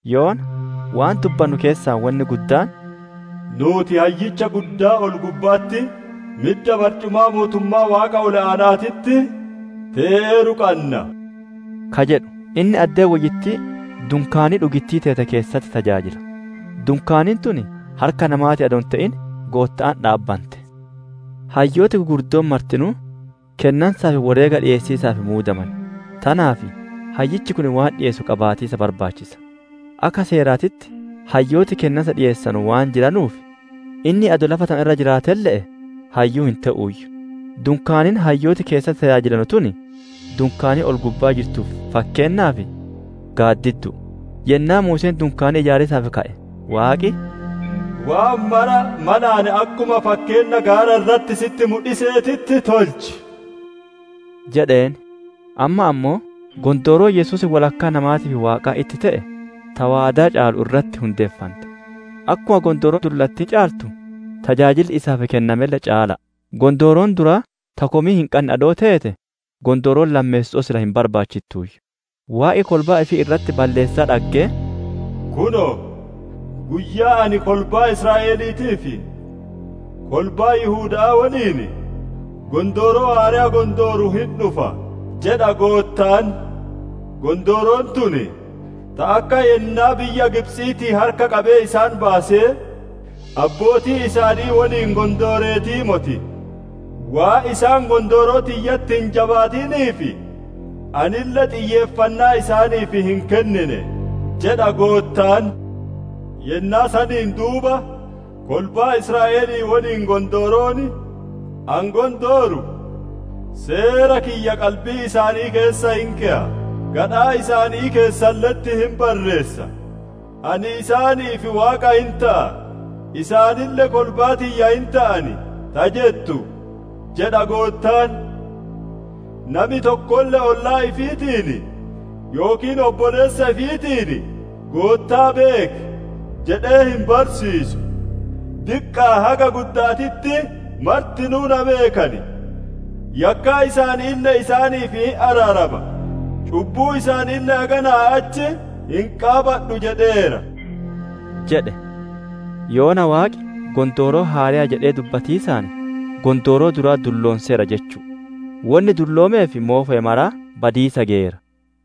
Yoona waan dubbannu keessaa wonni guddaan, «Nuuti Hayyicha Guddaa ol-gubba'atti midda barcumaa mootummaa Waaqa ol-aana'aatitti te'eeru qanna» ka jedhu. Inni addee woyyittii dunkaanii dhugittii teete, keessatti tajaajila; dunkaaniin tun harka namaatiin adoo hin te'in Gootta'aan dhaabbante. Hayyooti gugurdoon martinuu, kennansaa fi woreega dhiyeessiisaaf muudaman; tanaaf hayyichi kun waan dhiyeessu qabaatiisa barbaachisa. Akka seeraatitti hayyooti kennansa dhiyeessanu waan jiranuuf, inni adoo lafa tana irra jiraatelle'e hayyuu hin te'uuyyu. Dunkaaniin hayyooti keessatti tajaajilanu tun, dunkaanii ol-gubbaa jirtuuf fakkeennaa fi gaaddiddu'u; yennaa Muuseen dunkaanii ijaarsaaf ka'e Waaqi, «Waan mara malaan akkuma fakkeenna gaara irratti sitti mudhiseetitti tolchi!» jedheen. Amma ammoo, gondooroon Yesuus wodhakkaa namaatii fi Waaqaa itti te'e, ta waadaa caalu irratti hundeeffante, akkuma Gondooroo Qaraa caaltu, tajaajilli isaaf kennamelle caala'a. Gondooroon duraa ta komii hin qanne adoo teete, gondooroon lammeesso'oo sila hin barbaachittuuyyu. Waaqi kolbaa ifii irratti balleessaa dhaggee, «‹Kunoo, guyyaan ani kolbaa Israa'eliitii fi kolbaa Yihuda'aa woliin, gondooroo haareya gondooru hin dhufa› jedha Goottaan. ‹Gondooroon tun, ta akka yennaa biyya Gibxiitii harka qabee isaan baase, abbootii isaanii woliin gondooreetii moti; waan isaan gondooroo tiyyatti hin jabaatiniif, anille xiyyeeffannaa isaaniif hin kennine› jedha Goottaan. ‹Yennaa saniin duuba, kolbaa Israa'elii woliin gondooroon ani gondooru, Seera kiyya qalbii isaanii keessa hin keya; gadhaa isaanii keessalle'etti hin barreessa. Ani isaaniif Waaqa hin te'a; isaanille kolbaa tiyya hin te'an; ta jettu› jedha Goottaan. ‹Nami tokkolle ollaa ifiitiin yookiin obboleessa ifiitiin, Goottaa beeki! Jedhee hin barsiisu; diqqa'aa haga gudda'aatitti martinuu na beekan. Yakkaa isaaniille isaaniif hin araarama, cubbuu isaaniille haganaa achi hin qaabadhu› jedheera» jedhe. Yoona Waaqi, «Gondooroo haareya» jedhee dubbatiisaan, gondooroo duraa dulloonseera jechu'u; wonni dulloomee fi moofoye maraa badiisa geyeera.